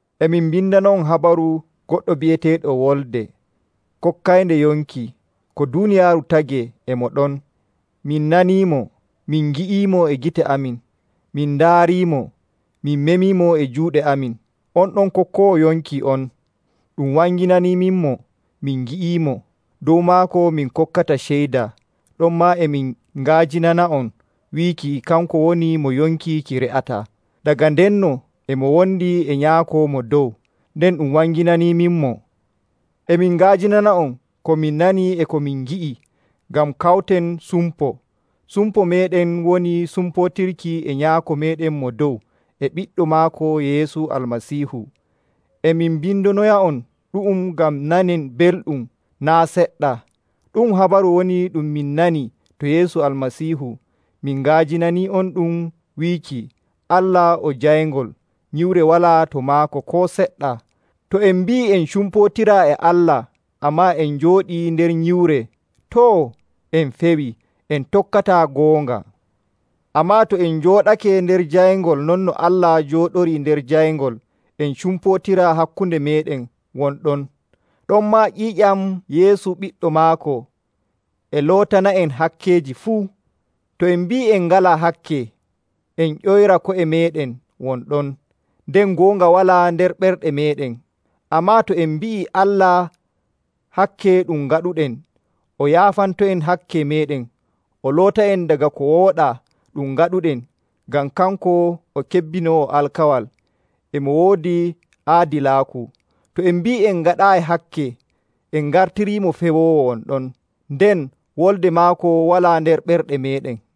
E min mbindana'on habaru goɗɗo bi'eteeɗo Wolde kokkaynde yonki. Ko duuniyaaru tagee e mo ɗon. Min naniimo, min ngi'iimo e gite amin. Min ndaariimo, min meemiimo e juuɗe amin. On ɗon kokkoowo yonki on, ɗum wanginaniiminmo, min ngi'imo. Dow maako min kokkata ceyda, ɗonmaa e min nga'ajinana'on wiiki kanko woni mo yonki ki re'ataa. Daga ndenno e mo wondi e Nyaako Mo Dow, nden ɗum wanginaniiminmo. E min nga'ajinana'on ko min nani e ko min ngi'i ngam kawten sumpo. Sumpo meeɗen woni sumpootirki e Nyaako meeɗen Mo Dow e Ɓiɗɗo maako Yeesu Almasiihu. E min mbindonoya'on ɗu'um ngam nanen belɗum naa' seɗɗa. Ɗu'um habaru woni ɗum min nani to Yeesu Almasiihu min nga'ajinani'onɗum wiiki, Allah o Jayngol, nyiwre walaa to maako koo seɗɗa. To en mbi'ii en cumpootira e Allah, ammaa en njooɗii nder nyiwre, too, en pewii, en tokkataa goonga. Ammaa to en njooɗake nder jayngol non no Allah jooɗorii nder jayngol, en cumpootira hakkunde meeɗen won ɗon. Ɗonmaa ƴiiƴam Yeesu Ɓiɗɗo maako e lootana'en hakkeeji fuu. To en mbi'ii en ngalaa hakke, en ƴoyra ko'e meeɗen won ɗon, nden goonga walaa nder ɓerɗe meeɗen. Ammaa to en mbi'ii Allah hakke ɗum ngaɗuɗen, o yaafanto'en hakke meeɗen, o loota'en daga ko wooɗaa ɗum ngaɗuɗen, ngam kanko o kebbinoowo alkawal, e mo woodi aadilaaku. To en mbi'ii en ngaɗaayi hakke, en ngartiriimo pewoowo won ɗon, nden wolde maako walaa nder ɓerɗe meeɗen.